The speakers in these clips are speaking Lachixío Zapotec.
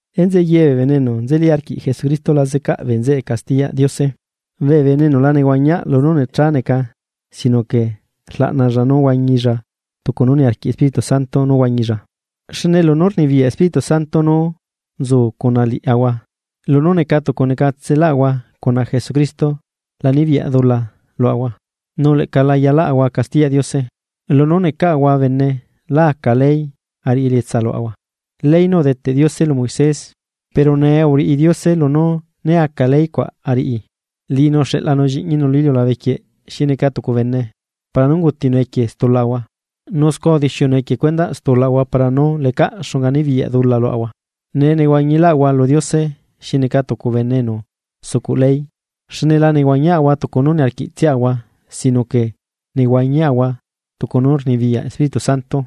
Enzeꞌe ye bee bene enu nzeli arquiꞌ Jesucristo la zecaꞌ bee bene zeꞌe castiyaꞌ Diose. Bee bene enu la nehuañiaꞌ lunú necha neca sino que rlaꞌnalla nú huañilla tucu nú niarquiꞌ Espíritu Santo nú huañilla. Xne lunú rnibiyaꞌ Espíritu Santo nú nzu cuna liaꞌahua lunú neca tucu necatseꞌlaꞌahua cuna Jesucristo la nibiyaꞌ dula luaꞌahua, nu leꞌca la yalaꞌahua castiyaꞌ Diose. Lunú necaꞌahua bene lá aca ley ariꞌi elietsa luaꞌahua, ley nú udeteꞌ Diose lu Moisés. Pero nee uriꞌi Diose lunú né aca ley cuaꞌ ariꞌi. Liꞌinu uxeꞌlanu Lliꞌñinu lu iliulabe quieꞌ xi neca tucu bene para nú ungutinu equie stulaꞌahua, nu scua udixiunu equie cuendaꞌ stulaꞌahua para nú lecaꞌ xunga nibiyaꞌ dula luaꞌahua. Nee nehuañiꞌlaꞌahua lu Diose xi neca tucu bene enu sucuꞌ ley, xne la nehuañiaꞌahua tucu nú niarquiꞌtsiaꞌahua sino que nehuañiaꞌahua tucu nú rnibiyaꞌ Espíritu Santo.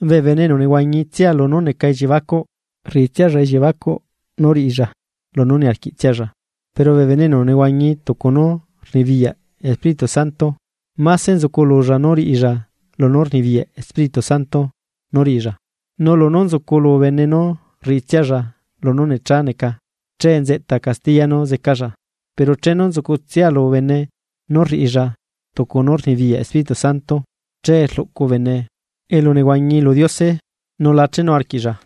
Bee bene enu nehuañitsia lunú neca elliebacuꞌ, rriꞌitsialla elliebacuꞌ nú riꞌilla lunú niarquiꞌtsialla. Pero bee bene enu nehuañi tucu nú rnibiyaꞌ Espíritu Santo, máse nzucululla nú riꞌilla lunú rnibiyaꞌ Espíritu Santo nú riꞌilla. Nu lunú nzuculu bene nú rriꞌitsialla lunú necha neca, che nzeꞌta castiya nú zecalla, pero chenu nzucutsialu bene nú rriꞌilla tucunú rnibiyaꞌ Espíritu Santo che rluꞌcu bene elunehuañi lu Diose nu la chenu arquiꞌlla.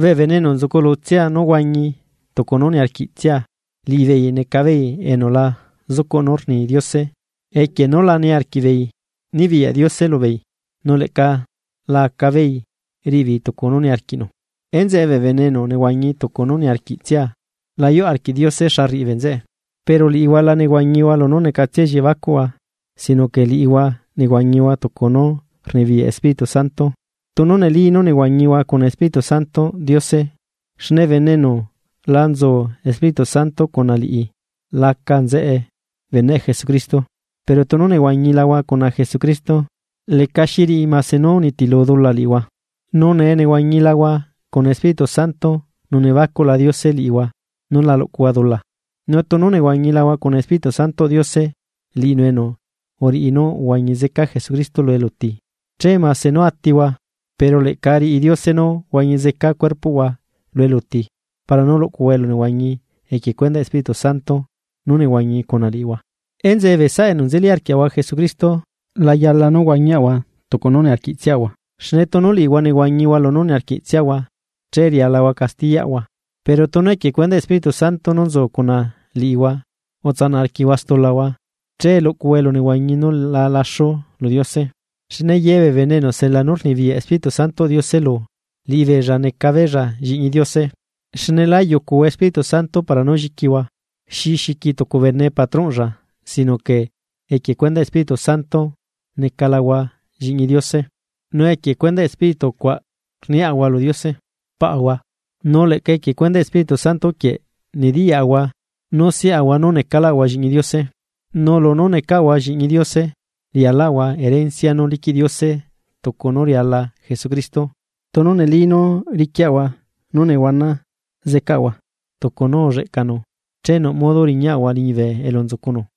Bee bene enu nzuculutsia nú huañi tucu nú niarquiꞌtsia, liꞌibeei necabeei enu la zucuꞌ nú rni Diose equie nú la niarquiꞌbeei nibiyaꞌ Diose lubeei nu leꞌca la acabeei riꞌibeei tucu nú niarquiꞌnu. Enzeꞌe bee bene enu nehuañi tucu nú niarquiꞌtsia, la yuꞌ arquiꞌ Diose xa rriꞌibee nzeꞌe. Pero liꞌihua la nehuañihua lunú necatsia elliebacuꞌhua, sino que liꞌihua nehuañihua tucu nú rnibiyaꞌ Espíritu Santo, tunu neli nú nehuañihua cuna Espíritu Santoꞌ Diose, xne bene enu la nzu Espíritu Santo cuna liꞌi laca nzeꞌe beneꞌ Jesucristo. Pero tunu nehuañilahua cuna Jesucristo, lecaxi riꞌi mase nú unitilu dula liꞌihua. Nu nee nehuañilahua cuna Espíritu Santo nu nebacuꞌla Diose liꞌihua nú la luꞌcuhua dula. Nu tunu nehuañilahua cuna Espíritu Santoꞌ Diose, liꞌinu enu uriꞌi nú uhuañi zeca Jesucristo lu eluti, che mase nú atihua, pero leꞌca riꞌi Diose nú huañi zeca cuerpoꞌhua lu eluti para nú luꞌcuhua elunehuañi equie cuendaꞌ Espíritu Santo nú nehuañi cuna liꞌihua. Enzeꞌe bee saꞌa enu nzeli arquiaꞌahua Jesucristo, la yala nú huañiaꞌahua tucu nú niarquiꞌtsiaꞌahua. Xne tunu liꞌihua nehuañihua lunú niarquiꞌtsiahua, che rialahua castiyaꞌhua, pero tunu equie cuendaꞌ Espíritu Santo nú nzu cuna liꞌihua utsanaꞌ arquiꞌhua stulahua che luꞌcuhua elunehuañi nú la laxuaꞌ lu Diose. Xne yebee bene enu sela nú rnibiyaꞌ Espíritu Santoꞌ Diose lu, liꞌibeella neca beella lliꞌñi Diose. Xne lá yucuhua Espíritu Santo para nú lliquihua, xi xiqui tucu bene patronꞌlla sino que equie cuendaꞌ Espíritu Santo necalahua lliꞌñi Diose nu equie cuendaꞌ Espíritu cuaꞌ rniaꞌahua lu Diose: “¡Paꞌahua!” Nu leꞌca equie cuendaꞌ Espíritu Santo quieꞌ nediyaꞌahua nú siꞌahua nú necaꞌlaꞌahua lliꞌñi Diose. Nu lunú necaꞌahua lliꞌñi Diose rialaꞌahua herencia nú liquiꞌ Diose tucu nú riala Jesucristo, tunu neli nú riquiaꞌahua nú nehuana zeꞌcaꞌahua tucu nú ulleꞌcanu che nuꞌ modo riñaꞌahua liñibe elu nzucunu.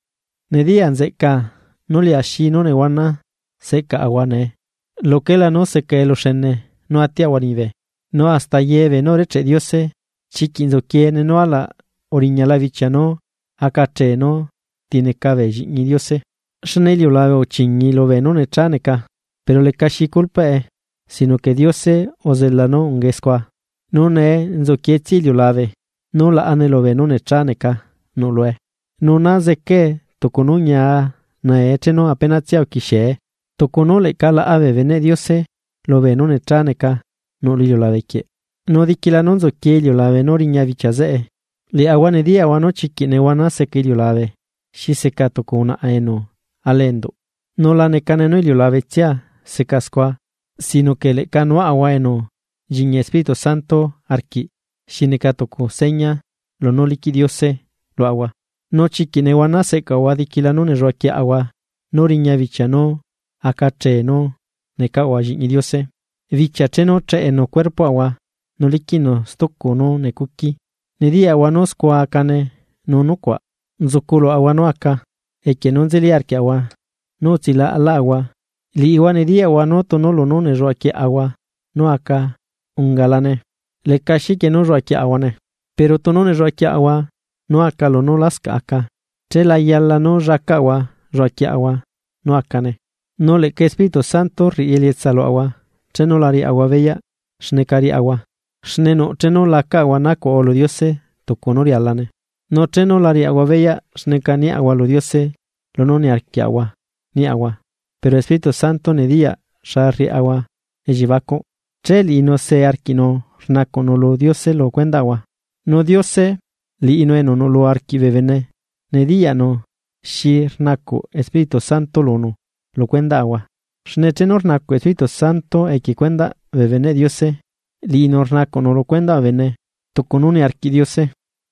Nediya nzeꞌcaa nú liaxi nú nehuana seꞌcaꞌahua nee, luquela nú seca eluxene nú atiaꞌahua liñibe. Nu hasta yebeenú urecheꞌ Diose, chiquiꞌ nzuquiene nú alaꞌ uriñala bichia nú acachee nú tineca bee lliꞌñi Diose. Xne iliulabe uchiñii lubeenú necha neca, pero lecaxi culpaꞌe, sino que Diose uzela nú ungae scua. Nu nee nzuquietsia iliulabe, nú laꞌane lu beenú necha neca nuꞌlue, nu naa zecae tucu nú ñia nae chenu apenatsia uquixiee, tucu nú leꞌca laꞌa bee beneꞌ Diose lubee nú necha neca nuꞌ lu iliulabequieꞌ. Nu diquila nú nzuquie iliulabe nú riña bichia zeꞌe, liaꞌahua nediyaꞌahua nú chiquiꞌ nehuana seca iliulabe xi seca tucu unaꞌa enu ala enduꞌ. Nu la necane nú iliulabetsia seca scua sino que leꞌca nuaꞌahua enu nchiñi Espíritu Santo arquiꞌ xi neca tucu seña lunú liquiꞌ Diose luaꞌahua. Nu chiquiꞌ nehuana seꞌcaꞌahua diquila nú nelluaquieꞌahua nú riña bichia nú acachee nú necaꞌahua lliꞌñi Diose, bichia chenu cheꞌenu cuerpoꞌahua nu liquiꞌnu stucu nú necuqui. Nediyaꞌahua nú scua acane nu nucuaꞌ nzuculuaꞌahua nú aca equie nú nzeli arquiaꞌahua nú utsilaꞌalaꞌahua, liꞌihua nediyaꞌhua nú tunu lunú nelluaquieꞌahua nú aca ungalane, leca xiquie nú lluaquieꞌlaꞌahuane. Pero tunu nelluaquieꞌahua nú aca lunú lascaꞌ aca, che layala nú llacaꞌahua lluaquieꞌahua nú acane. Nu leꞌca Espíritu Santo riꞌi elietsa luaꞌahua chenu la riaꞌahua beyaꞌ xneca riaꞌahua, xne nuꞌ chenu lacaꞌahua nacuaꞌahua lu Diose tucu nú rialane. Nu chenu la riaꞌahua beyaꞌ xneca niaꞌahua lu Diose lunú niarquiaꞌahua niaꞌahua, pero Espíritu Santo nediyaꞌ xa rriaꞌahua elliebacuꞌ, che liꞌinu see arquiꞌnu rnacuꞌnu lu Diose lu cuendaꞌahua. Nu Diose, liꞌinu enu nuꞌlu arquiꞌ bee bene, nediyaꞌnu xi rnacuꞌ Espíritu Santo lunu lu cuendaꞌahua. Xne chenu rnacuꞌ Espíritu Santo equie cuendaꞌ bee beneꞌ Diose, liꞌinu rnacuꞌnu lu cuendaꞌ bee bene tucu nú niarquiꞌ Diose.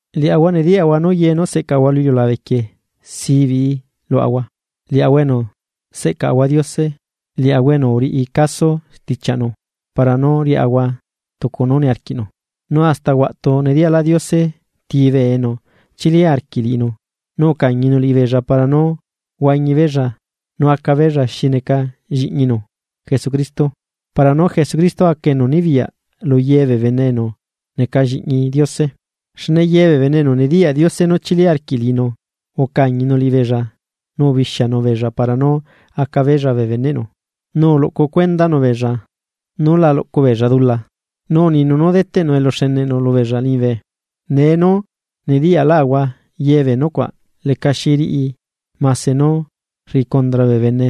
Liaꞌahua nediyaꞌahua nú ye nú seꞌcaꞌahua lu iliulabequie, zibiꞌi luaꞌahua, liaꞌahua enu seꞌcaꞌahua Diose liaꞌahua enu uriꞌi caso stichiaꞌnu para nú riaꞌahua tucu nú niarquiꞌnu. Nu hasta huaꞌtu nediyaꞌlaꞌ Diose ti bee enu chili arquiꞌ liꞌinu, nu ucañinu liꞌibeella para nú huañi beella, nu acabeella xi neca lliꞌñinu Jesucristo, para nú Jesucristo aca enu nibiyaꞌ lu ye bee bene enu neca lliꞌñi Diose. Xne ye bee bene enu nediyaꞌ Diose nú chili arquiꞌ liꞌinu, ucañinu liꞌibeella nu ubixianu beella para nú aca beella bee beneꞌnu, nu uluꞌcu cuendanu beella nú la luꞌcubeella dula, nu uninu nú deteꞌnu eluxene lubeella liñibe. Nee nú nediyaꞌlaꞌahua yebee nucuaꞌ lecaxi riꞌi mase nú rriꞌi cundra bee bene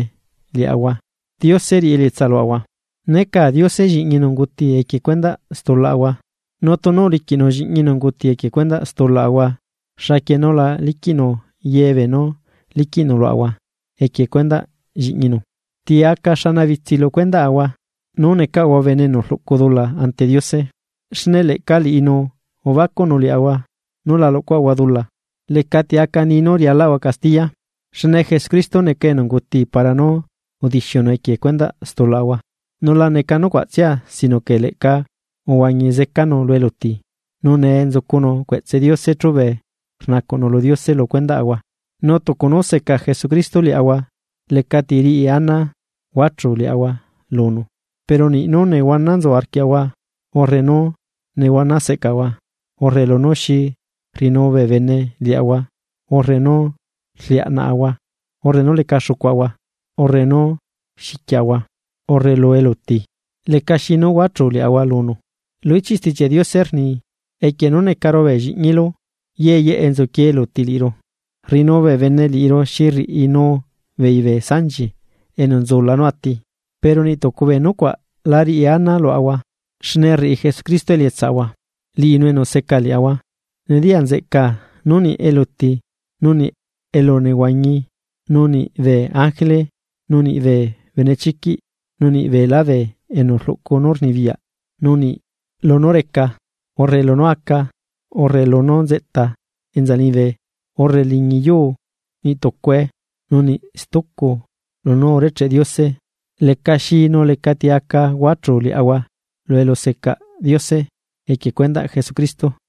liaꞌahua, Diose riꞌi elietsa luaꞌahua. Necaa Diose lliꞌñinu unguti equie cuendaꞌ stulaꞌahua. Nu tunu uliquiꞌnu lliꞌñinu unguti equie stulaꞌahua. ¿Xaquie nú la liquiꞌnu ye beenú liquiꞌnu luaꞌahua equie cuendaꞌ lliꞌñinu? ¿Ti aca xanabitsi lu cuendaꞌahua nú necaꞌahua bene enu rluꞌcu dula ante Diose? Xne leꞌca liꞌinu ubacuꞌnu liaꞌahua nú la luꞌcuaꞌahua dula. Lecati aca ni nú rialaꞌahua castiya, xne Jesucristo neca enu unguti para nú udixiunu equie cuendaꞌ stulaꞌahua, nu la neca nucuaꞌtsia sino que leꞌca uhuañi zecanu lu eluti, nu nee nzucunu cueꞌtse Diose chube rnacuꞌnu lu Diose lu cuendaꞌahua. Nu tucu nú seca Jesucristo liaꞌahua lecati riꞌi ana huachuu liaꞌahua lunu. Pero niꞌ nú nehuana nzu arquiaꞌahua, urre nú nehuana seꞌcaꞌahua, urre lunú xi rriꞌinuu bee bene liaꞌahua, urre nú rliaꞌnaꞌahua, urre nú leca xucuaꞌahua, urre nú xiquiaꞌahua, urre lu eluti, lecaxi nú huachuu liaꞌahua lunu. Lu ichiꞌ Stichiaꞌ Diose rni: Equie nú necaru bee lliꞌñilu, ye yeꞌe nzuquie eluti liꞌiru, rriꞌinu bee bene liꞌiru xi rriꞌinu beei bee sanchi enu nzula nú ati. Pero niꞌ tucu bee nucuaꞌ la riꞌi ana luaꞌahua xne rriꞌi Jesucristo elietsa luaꞌahua, liꞌinu enu seca liaꞌahua. Nediya nzeꞌcaa nu niꞌ eluti, nu niꞌ elunehuañi, nu niꞌ bee ángele, nu niꞌ bee benechiquiꞌ, nu niꞌ beelá bee enu rluꞌcu nú rnibiyaꞌ, nu niꞌ lunú reca, urre lunú aca, urre lunú nzeꞌta enza liñibe, urre liñi yuu, niꞌ tucue nu niꞌ stucu lunú urecheꞌ Diose, lecaxi nu lecati aca huachuu liaꞌahua lu elusecaꞌ Diose equie cuendaꞌ Jesucristo.